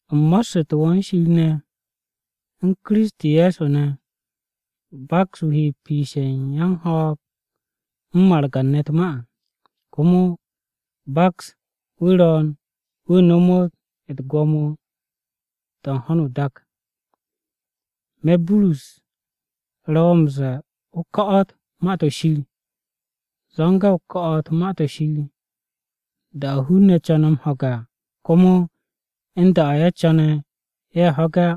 U̱m mo̱ssu̱te̱ wo̱ u̱n Shir ne̱, u̱n Kiristi Ye̱so ne̱. Baks wu̱ he piishe̱ u̱n yan-ho̱o̱g u̱n margan-ne̱ u̱t-ma à. Komo baks wu̱ ro̱o̱n wu̱ nomot u̱t-gwo̱mo to̱ u̱n ho̱no o-dak. Me̱, Burus, ro̱ wo̱ m-ze̱e̱ o ko̱'o̱t Ma-to̱ Shir. Zo̱nge̱ o ko̱'o̱t Ma-to̱ Shir, da-o̱ hun-ne̱ co̱ne̱ m-ho̱ge̱ à, komo u̱n da-o̱ ye̱ co̱ne̱ ye̱ ho̱ge̱ á.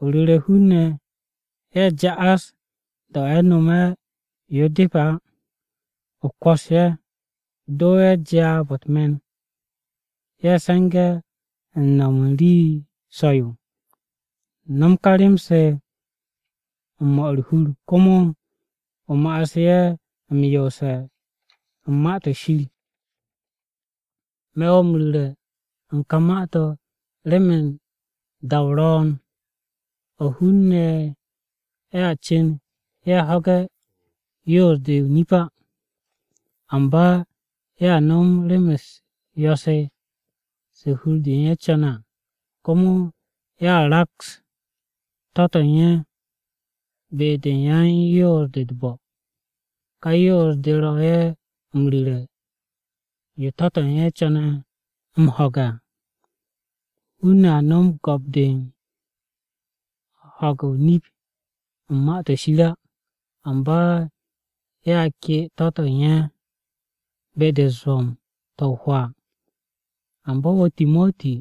O ru̱re̱ hun-ne̱ ye̱ ja'as, da-o̱ ye̱ no̱me̱ yo depe̱ á, o kwo̱s ye̱. O do ye̱ jaab-o̱ u̱t-me̱n, ye̱ se̱nge̱ u̱n no̱m u̱n rii so̱-yo. No̱m ka rem-se u̱n 'mo̱ u̱r-hur, komo o ma'as ye̱ m-yoose̱ u̱n Ma-to̱ Shir. Me̱ wo̱ m-ru̱re̱ u̱n ka ma-to̱ remen da-o ro̱o̱n, o̱ hun-ne̱ a cu̱n ye̱ ho̱ge̱ yoos-de o-nip á. Amba ye̱a no̱m rem-u̱s yo̱-se se hur-de u̱n ye̱ co̱ne̱ à. Komo ye̱a raks to̱-to̱ u̱n ye̱ be-de yan-yoos-de u̱t-bo̱. Ka yoos-de ro̱ ye̱ m-ru̱re̱ yo to̱-to̱ u̱n ye̱ co̱ne̱ m-ho̱ge̱ à. Hun-ne̱ a no̱m go̱p-de u̱n ho̱ge̱ o-nip u̱n Ma-to̱ Shir á, amba ye̱a ke to̱-to̱ u̱n ye̱ be-de u̱t-zwo̱m to̱ o-hwaa. Amba wo̱ Timoti,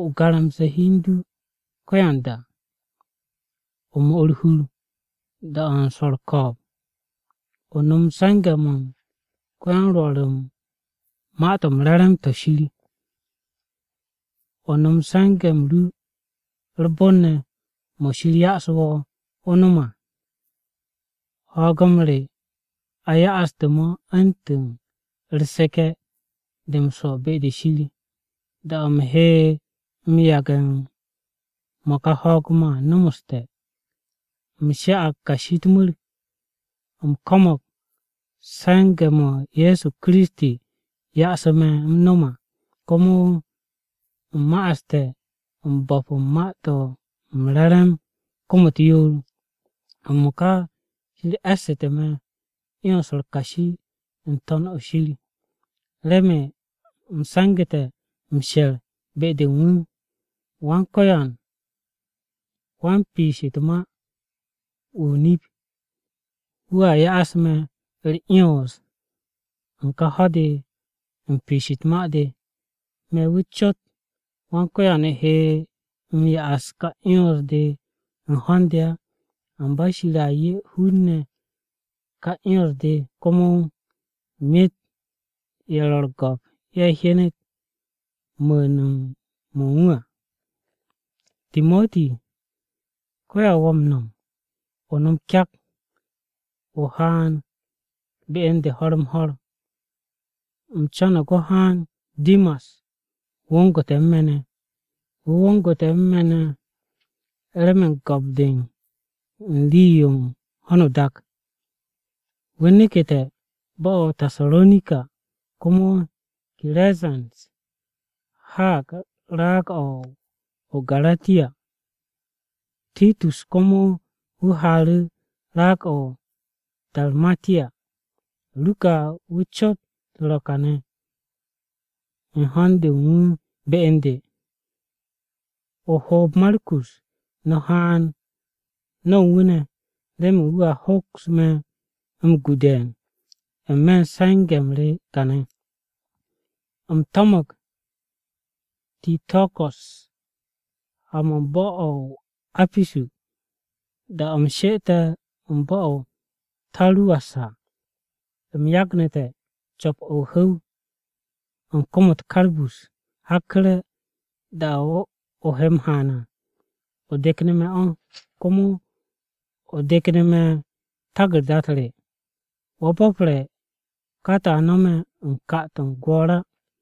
o garamse̱ hi u̱n du ko̱yanda. O 'mo u̱r-hur, da-o̱ u̱n swo̱ u̱r-ko̱o̱b. O no̱m se̱nge̱-mo̱ u̱n ko-ya-m-Rwo̱r u̱n Ma-to̱ m-Re̱re̱m, to̱ Shir. O no̱m se̱nge̱-m ru u̱r-bon ne̱, mo̱ Shir ya'asu̱ wo̱, o nom à. Ho̱o̱g-m re, a ya'aste̱ mo̱ u̱ntu̱n u̱r-seke̱ de m-swo̱ be-de Shir. Da-o̱ u̱m he m-yage̱ u̱n mo̱ ka ho̱o̱g-mo̱ à, nomoste̱. U̱m sha'ag kashi u̱t-mu̱r, u̱m ko̱mo̱g se̱nge̱-mo̱ Ye̱so Kiristi, yase̱ me̱ u̱m no̱m à. Komo, u̱m ma'aste̱ m-bo̱p u̱n Ma-to̱ m-Re̱re̱m kom-u̱t yoor. M-mo̱ka Shir e̱ssu̱te̱ me̱ 'yons-u̱r kashi n-to̱n o-shir, remen u̱m se̱ngu̱te̱ m-she̱r be-de u̱n wu̱. Wan-Ko̱yan wan-piish u̱t-ma wu̱ o-nip, wu̱a ya'as me̱ u̱r-'yons u̱n ka ho̱-de u̱n piish u̱t-ma de. Me̱ wu̱ cot Wan-Ko̱yan he m-ya'as u̱n ka 'yons-de u̱n ho̱n-de á. Amba Shir a 'ye hun-ne̱ ka 'yons-de, komo myet u̱n ye̱ ro̱ u̱r-go̱p ye̱ hyenet mu̱u̱n-mo̱ u̱n wu̱ à. Timoti, ko̱yan wo̱ m-no̱m, o no̱m kyak, o haan be u̱n de ho̱r-m-ho̱r. U̱m co̱no̱g o haan remen Dimas wongu̱te̱ u̱n me̱ ne̱. Wu̱ wongu̱te̱ u̱n me̱ remen go̱p-de u̱n rem-se u̱n ho̱no o-dak. Wu̱ neke̱te̱ bo̱-o̱ o-Tasaronika. Komo Kirezens haag raag-o̱ o-Garatiya. Titus komo wu̱ haaru̱ raag-o̱ o-Darmatiya. Ruka wu̱ cot ro̱ kane̱ u̱n ho̱n-de u̱n wu̱ be u̱n de. O hoob Markus, no̱ haan no̱ u̱n wu̱ ne̱ remen wu̱a hoks me̱ m-gu de̱e̱n, n-me̱ u̱n se̱nge̱-m re kane̱. U̱m to̱mo̱g Tiko̱ko̱s ha-mo̱ u̱n bo̱-o̱ o-Apisu. Da-o̱ u̱m she'ete̱ u̱n bo̱-o̱ o-To̱ruwas à, u̱m yagnu̱te̱ co̱p-o̱ o-hu̱w u̱n kom-u̱t Karbus. Hakku̱re̱, da-de o he m-haan à, o de̱knu̱ me̱ o̱. Komo o de̱knu̱ me̱ taku̱rda-u̱t re. Wo̱ bo̱pre̱ ka to̱ a no̱me̱ u̱n ka-to̱ u̱n gwo̱o̱r á.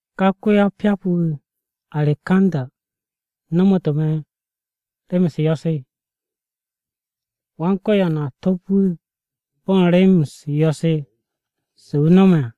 Ka ko-ya-o-pyap-wu̱ Arekanda nomotu̱ me̱ rem-u̱s yo̱-se. Wan-Ko̱yan a top wu̱ bo̱ u̱n rem-u̱s yo̱-se se wu̱ no̱me̱ à.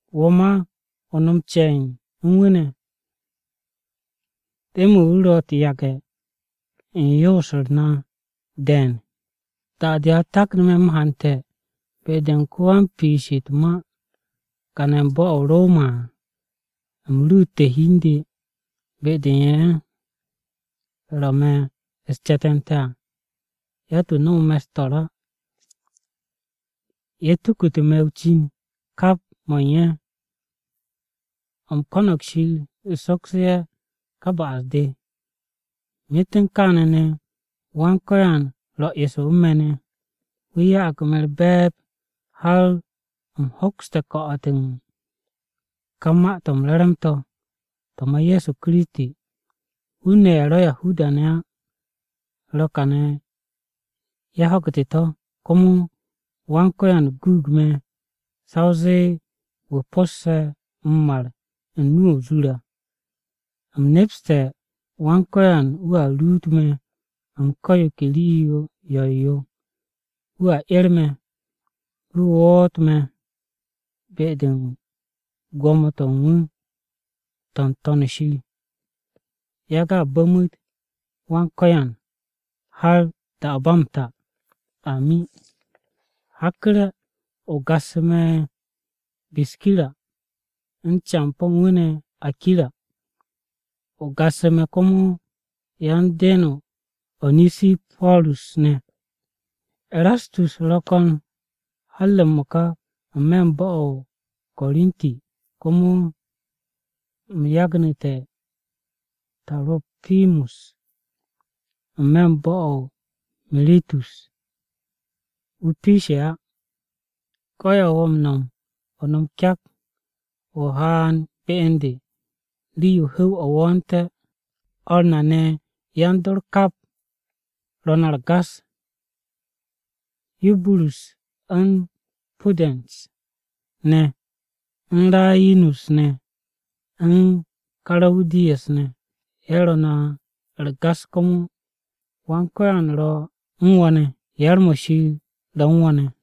Wo̱ ma o no̱m ce̱e̱n u̱n wu̱ ne̱, remen wu̱ ro̱ u̱t-yage̱ u̱n yoos-u̱r na ne̱ de̱e̱n. Da-de a taknu̱ me̱ m-hante̱ be-de u̱n ko-wan-piish u̱t-ma kane̱ u̱n bo̱-o̱ o-Roma à, u̱m ruute̱ hi u̱n de be-de u̱n ye̱ ro̱ me̱ u̱s-ce̱te̱nte̱ à, yatt-wu̱ su̱'e̱ me̱ á. Ye̱ tukute̱ me̱ o-cin kap mo̱ u̱n ye̱. U̱m ko̱no̱g Shir sokse̱ ye̱ ka ba'as-de. Myet u̱n kaane̱ ne̱, Wan-Ko̱yan ro̱ eso u̱n me̱ ne̱. Wu̱ ya'ag me̱ u̱r-be̱e̱b, har u̱m hokste̱ ko̱'o̱t u̱n ka Ma-to̱ m-Re̱re̱m to̱, to̱ ma Ye̱so Kiristi. Hun-ne̱ ye̱ ro̱ Yahuda-ne̱ á ro̱ kane̱ ye̱ ho̱gu̱te̱ to̱. Komo Wan-Ko̱yan guug me̱ sa o zee wu̱ po̱sse̱ m-mar u̱n nu-o̱ o-zur à. U̱m nepste̱ Wan-Ko̱yan wu̱a ruut me̱ u̱n ko̱ yo ke rii yo̱-yo yo. Wu̱a 'er me̱, wu̱ woot me̱ be-de u̱n gwo̱mo-to̱ u̱n wu̱ to̱ n-To̱n o-shir. Yage̱ a bu̱mu̱t Wan-Ko̱yan, har da-o̱ ba m-ta! Amin. Hakku̱re̱ o gassu̱ me̱ Biskira, u̱n campo̱ u̱n wu̱ ne̱ Akira. O gassu̱ me̱ komo, yan-den-o Onesiporus ne̱. Erastus ro̱ ko̱n har m-mo̱ka n-me̱ bo̱-o̱ o-Korinti, komo u̱m yagnu̱te̱ Taro̱pimus n-me̱ bo̱-o o-Miritus wu̱ piishe̱ á. Ko̱yan wo̱ m-no̱m, o no̱m kyak, o haan be u̱n de rii-yo hu̱w-o̱ wo̱o̱nte̱. O̱r na ne̱ yan-dor kap, ro̱ no̱ u̱r-gas. Yuburus u̱n Pudens ne̱, u̱n Rayinus ne̱, u̱n Karawudiya ne̱, ye̱ ro̱ no̱ u̱r-gas komo. Wan-Ko̱yan ro̱ u̱n wo̱ ne̱! Yar-mo̱ Shir ro̱ u̱n no̱ ne̱!